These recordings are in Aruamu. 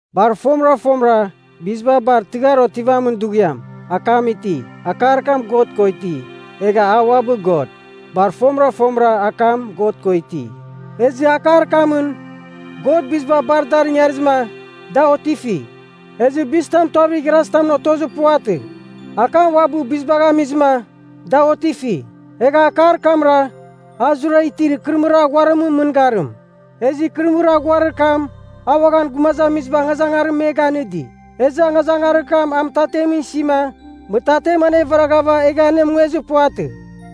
Bar fomɨra fomɨra, biziba bar tɨghar otivamin dughiam, Akam iti. Akar kam God ko iti, egha a uabɨ God. Bar fomɨra fomɨra Akam God ko iti. Ezɨ Akar kamɨn, God biziba bar dar ingarizɨma, da otifi. Ezɨ bizitam tuavir igharazi tamɨn otozir puvatɨ. Akam uabɨ bizibagh amizɨma, da otifi. Egha Akar kamra, a zurara itir ikɨrɨmɨrir aghuarimɨn mɨngarim. Ezɨ ikɨrɨmɨrir aghuarir kam, a uaghan gumazamiziba angazangarim me ganɨdi. Ezɨ angazangarir kam a mɨtatemɨn isima, mɨtatem anevaraghava egha anemungezir puvatɨ.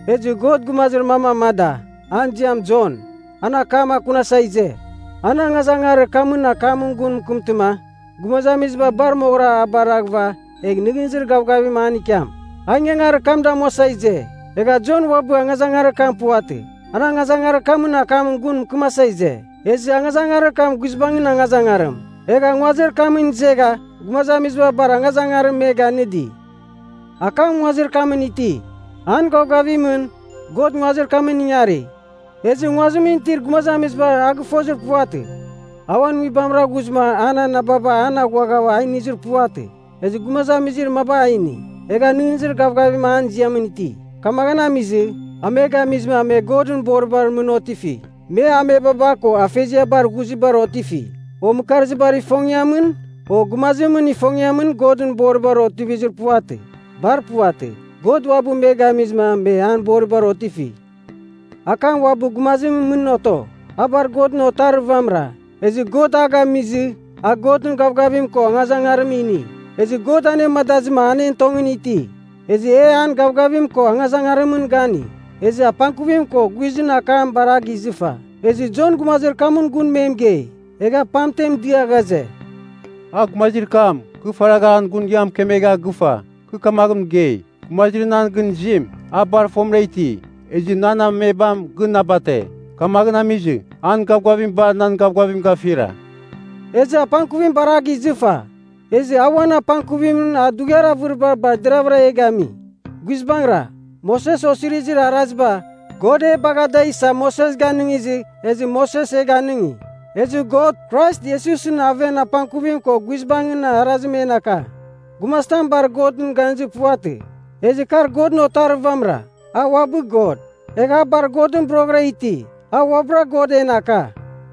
Ezɨ God gumazir mam amada, an ziam Jon. An akam akunasa ize. An angazangarir kamɨn akamɨn gun mɨkɨmtɨma, gumazamiziba bar moghɨra a baraghɨva egh nɨghnɨzir gavgavim an ikiam. A ingangarir kam damuasa ize. Egha Jon uabɨ angazangarir kam puvatɨ. An angazangarir kamɨn akamɨn gun mɨkɨmasa ize. Ezɨ angazangarir kam guizbangɨn angazangarim. Egha nguazir kamɨn izegha gumazamiziba bar angazangarim me ganɨdi. Akam nguazir kamɨn iti. An gavgavimɨn, God nguazir kamɨn ingari, ezɨ nguazimɨn itir gumazamiziba a gɨfozir puvatɨ. A uan nguibamra ghuzɨma an anababa an aghuagha a inizir puvatɨ. Ezɨ gumazamizir maba a ini, egha nɨghnɨzir gavgavim an ziamɨn iti. Kamaghɨn amizɨ, a me gamizɨma me Godɨn boribar mɨn otifi. Me amebaba ko afeziabar ghuzibar otifi, o mɨkarzibar ifongiamɨn, o gumazimɨn ifongiamɨn Godɨn boribar otivizir puvatɨ. Bar puvatɨ. God uabɨ me gamizɨma me an boribar otifi. Akam uabɨ gumazimɨn mɨn oto. A bar Godɨn Otarir vamɨra, ezɨ God a gamizɨ a Godɨn gavgavim ko angazangarim ini. Ezɨ God anemadazɨma an en tongɨn iti. Ezɨ e an gavgavim ko angazangarimɨn gani. Ezɨ apangkuvim ko guizɨn akam bar a gizɨfa. Ezɨ Jon gumazir kamɨn gun me mɨgei. Egha pamten dia ghaze, “A gumazir kam, kɨ faragha an gun ia mɨkemegha gɨfa. Kɨ kamaghɨn mɨgei, ‘Gumazir nan gɨn izim, a bar fomɨra iti, ezɨ nan amebam gɨn na bate. Kamaghɨn amizɨ, an gavgavim bar nan gavgavim gafira.’” Ezɨ apangkuvim bar a gizɨfa, ezɨ a uan apangkuvimɨn a dughiar avɨribar bar deravɨra e gami. Guizbangɨra, Moses Osirizir Araziba, God e bagha da isa Moses ganɨngizɨ, ezɨ Moses e ganɨngi. Ezɨ God, Krais Iesusɨn aven apangkuvim ko guizbangɨn arazim en aka. Gumazitam bar Godɨn ganizir puvatɨ. Ezɨ kar Godɨn Otarir vamɨra, a uabɨ God, egha a bar Godɨn boroghɨra iti. A uabɨra God en aka.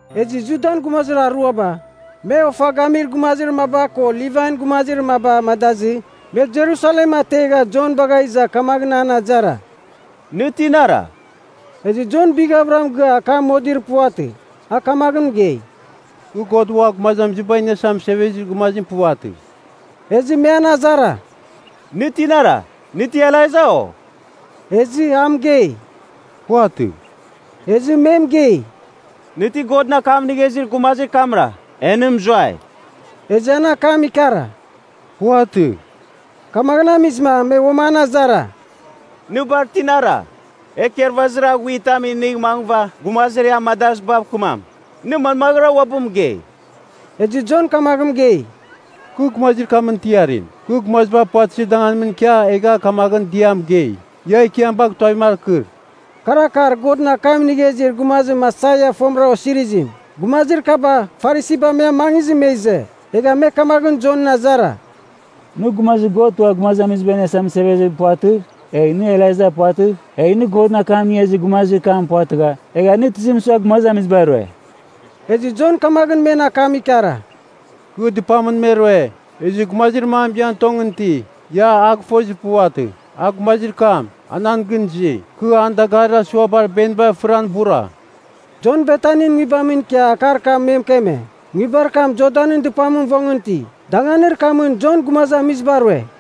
Ezɨ Judan gumazir aruaba, me ofa gamir gumazir maba ko Livain gumazir maba amadazɨ, me Jerusalem ategha Jon bagha iza kamaghɨn an azara, “Nɨ tinara?” Ezɨ Jon bighavɨra mɨgɨa akam modir puvatɨ. A kamaghɨn mɨgei, “Kɨ God Ua Gumazamiziba Iniasa Mɨsevezir Gumazim puvatɨ.” Ezɨ me an azara, “Nɨ tinara? Nɨ ti Elaija, o?” Ezɨ a mɨgei, “Puvatɨ.” Ezɨ me mɨgei, “Nɨ ti Godɨn akam inigha izir gumazir kamra, e nɨ mɨzuai.” Ezɨ an akam ikara, “Puvatɨ.” Kamaghɨn amizɨma, me uam an azara, “Nɨ bar tinara? E ikarvazir aghuitam inigh mangɨva gumazir e amadazɨbav kɨmam. Nɨ manmaghɨra uabɨ mɨgei?” Ezɨ Jon kamaghɨn mɨgei, “Kɨ gumazir kamɨn tiarim, kɨ gumaziba puvatɨzir danganimɨn ikia egha kamaghɨn dɨa mɨgei, ‘Ia Ekiam bagh tuavim akɨr.’” (Kar akar Godɨn akam inigha izir gumazim Aisaia fomɨra osirizim.) Gumazir kaba, Farisiba me amangizɨ me ize. Egha me kamaghɨn Jon azara, “Nɨ Gumazir God Ua Gumazamiziba Iniasa Mɨsevezim puvatɨgh, egh nɨ Elaija puvatɨgh, egh nɨ Godɨn akam inigha izir gumazir kam puvatɨgha, egha nɨ tizim sua gumazamiziba rue?” Ezɨ Jon kamaghɨn men akam ikara, “Kɨ dɨpamɨn me rue. Ezɨ gumazir mam ian tongɨn iti, ia a gɨfozir puvatɨ. A gumazir kam, a nan gɨn izi. Kɨ an dagarir asuabar beniba fɨran ibura.” Jon Betanin nguibamɨn ikia akar kam me mɨkeme, nguibar kam Jordanɨn dɨpamɨn vongɨn iti. Danganir kamɨn Jon gumazamiziba rue.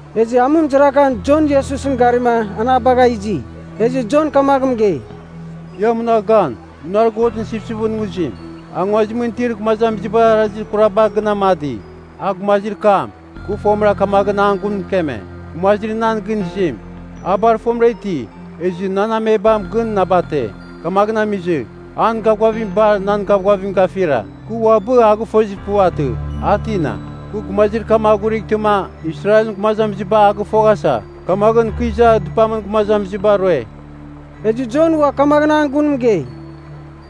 Ezɨ amɨmɨzarakan Jon Iesusɨn garima an a bagha izi. Ezɨ Jon kamaghɨn mɨgei. “Ia munagh gan! Munar Godɨn Sipsipɨn Nguzim. A nguazimɨn itir gumazamizibar arazir kuraba gɨn amadi! A gumazir kam, kɨ fomɨra kamaghɨn an gun mɨkeme, ‘Gumazir nan gɨn izim, a bar fomɨra iti, ezɨ nan amebam gɨn na bate. Kamaghɨn amizɨ, an gavgavim bar nan gavgavim gafira.’ Kɨ uabɨ a gɨfozir puvatɨ, a tina. Kɨ gumazir kam aghurightɨma, Israelɨn gumazamiziba a gɨfoghasa, kamaghɨn kɨ iza dɨpamɨn gumazamiziba rue.” Ezɨ Jon ua kamaghɨn an gun mɨgei,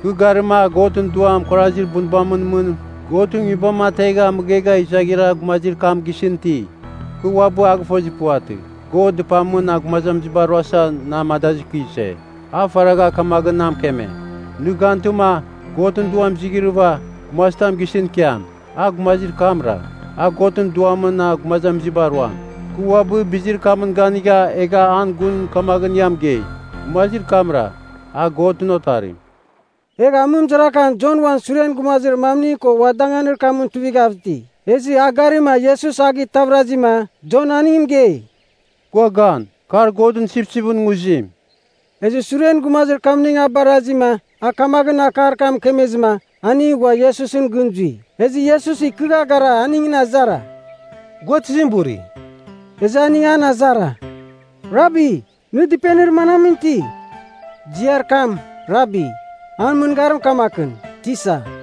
“Kɨ garima Godɨn Duam kuarazir bunbamɨn mɨn Godɨn Nguibam ategha mɨghegha izaghira gumazir kam gisɨn iti. Kɨ uabɨ a gɨfozir puvatɨ. God dɨpamɨn gumazamiziba ruasa na amadazɨ kɨ ize. A faragha kamaghɨn na mɨkeme, ‘Nɨ gantɨma, Godɨn Duam izighrɨghɨva, gumazitam gisɨn ikiam, a gumazir kamra, a Godɨn Duamɨn gumazamiziba ruam.’ Kɨ uabɨ bizir kamɨn ganigha egha an gun kamaghɨn ia mɨgei, gumazir kamra, a Godɨn Otarim.” Egha amɨmɨzarakan Jon uan suren gumazir mamning ko ua danganir kamɨn tuivighav iti. Ezɨ a garima Iesus a gitavɨrazɨma, Jon aning mɨgei, “Gua gan! Kar Godɨn Sipsipɨn Nguzim!” Ezɨ suren gumazir kamning a barazima a kamaghɨn akar kam mɨkemezɨma, aning ghua Iesusɨn gɨn zui. Ezɨ Iesus ikɨgha gara aningɨn azara, “Gua tizim buri?” Ezɨ aning an azara, “Rabi, nɨ dɨpenir manamɨn iti?” (Ziar kam “Rabi” an mɨngarim kamakɨn, “Tisa.”)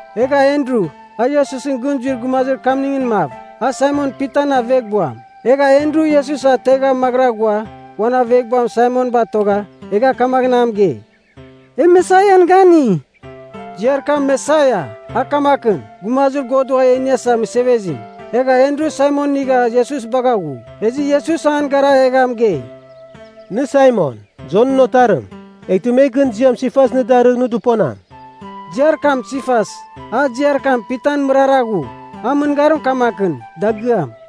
Egha Andru, a Iesusɨn gɨn zuir gumazir kamningɨn mav. A Saimon Pitan aveghbuam. Egha Andru Iesus ategha maghɨra ghua uan aveghbuam Saimon batogha, egha kamaghɨn a mɨgei, “E Mesaian gani.” (Ziar kam “Mesaia” a kamakɨn, “Gumazir God Ua E Iniasa Mɨsevezim.”) Egha Andru Saimon inigha Iesus bagha ghu. Ezɨ Iesus an gara egha mɨgei, “Nɨ Saimon, Jonɨn Otarim. Eghtɨ me gɨn ziam ‘Sifas’ nɨ darɨgh nɨ dɨponam.” (Ziar kam “Sifas,” a ziar kam “Pitan” mɨrara ghu. An mɨngarim kamakɨn, “Dagɨam.”)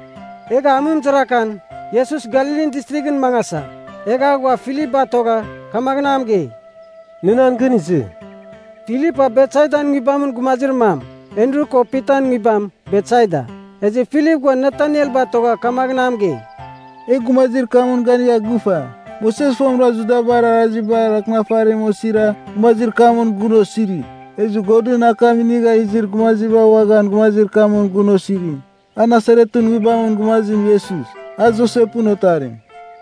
Egha amɨmɨzarakan, Iesus Galilin Distrighɨn mangasa. Egha a ghua Filip batogha, kamaghɨn a mɨgei, “Nɨ nan gɨn izɨ!” (Filip a Betsaidan nguibamɨn gumazir mam. Andru ko Pitan nguibam, Betsaida.) Ezɨ Filip ghua Nataniel batogha kamaghɨn a mɨgei, “E gumazir kamɨn ganigha gɨfa, Moses fomɨra Judabar Arazibar Akɨnafarimɨn osira gumazir kamɨn gun osiri. Ezɨ Godɨn akam inigha izir gumaziba uaghan gumazir kamɨn gun osiri. A Nasaretɨn nguibamɨn gumazim Iesus, a Josepɨn otarim.”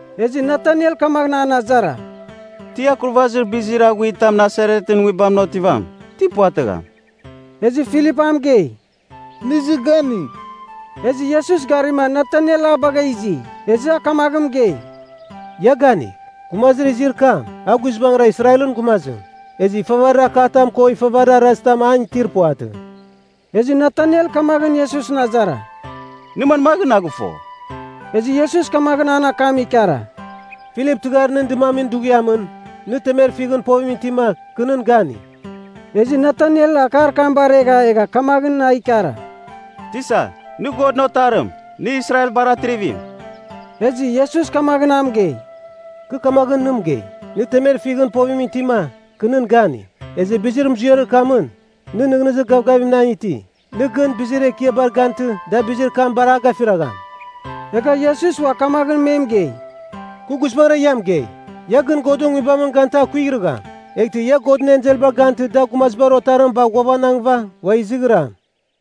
Ezɨ Nataniel kamaghɨn an azara, “Ti akurvazir bizir aghuitam Nasaretɨn nguibamɨn otivam? Ti puvatɨgham!” Ezɨ Filip a mɨgei, “Nɨ izɨ ganigh.” Ezɨ Iesus garima Nataniel a bagha izi. Ezɨ a kamaghɨn mɨgei, “Ia ganigh. Gumazir izir kam, a guizbangɨra Israelɨn gumazim. Ezɨ ifavarir akatam ko ifavarir arazir tam an itir puvatɨ.” Ezɨ Nataniel kamaghɨn Iesusɨn azara, “Nɨ manmaghɨn na gɨfo?” Ezɨ Iesus kamaghɨn an akam ikara, “Filip tɨghar nɨn dɨmamin dughiamɨn, nɨ temer fighɨn povimɨn itima, kɨ nɨn gani.” Ezɨ Nataniel akar kam baregha egha kamaghɨn a ikara, “Tisa, nɨ Godɨn Otarim! Nɨ Israelbar Atrivim!” Ezɨ Iesus kamaghɨn a mɨgei, “Kɨ kamaghɨn nɨ mɨgei, nɨ temer fighɨn povimɨn itima, kɨ nɨn gani. Ezɨ bizir muziarir kamɨn, nɨ nɨghnɨzir gavgavim nan iti. Nɨ gɨn bizir ekiabar gantɨ da bizir kam bar a gafiragham.” Egha Iesus ua kamaghɨn me mɨgei, “Kɨ guizbangɨra ia mɨgei, ia gɨn Godɨn Nguibamɨn gantɨ a kuighrɨgham, eghtɨ ia Godɨn enselbar gantɨ da Gumazibar Otarim bagh ghuavanangɨva, ua izighram.”